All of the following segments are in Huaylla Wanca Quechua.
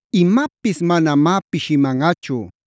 Imapis manamá pishimanꞌachu.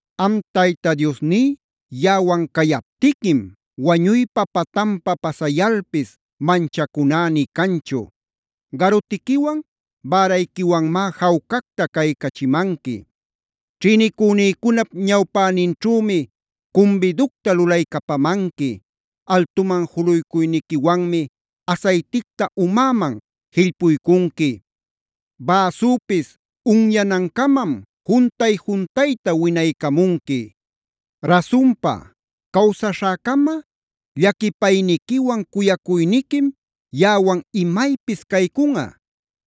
Am Tayta Diosní yaꞌawan cayaptiquim wañuypa patanpa pasayalpis manchacuná nï canchu.e Garutiquiwan bärayquiwanmá jawcacta caycachimanqui. Ćhïnicünïcunap ñawpäninćhümi cumbiducta lulaycapamanqui, altuman juluycuyniquiwanmi asayticta umäman jillpuycunqui, bäsüpis unyanancamam juntay-juntayta winaycamunqui. Rasunpa, cawsaśhäcama llaquipayniquiwan cuyacuyniquim yaꞌawan imaypis caycunꞌa.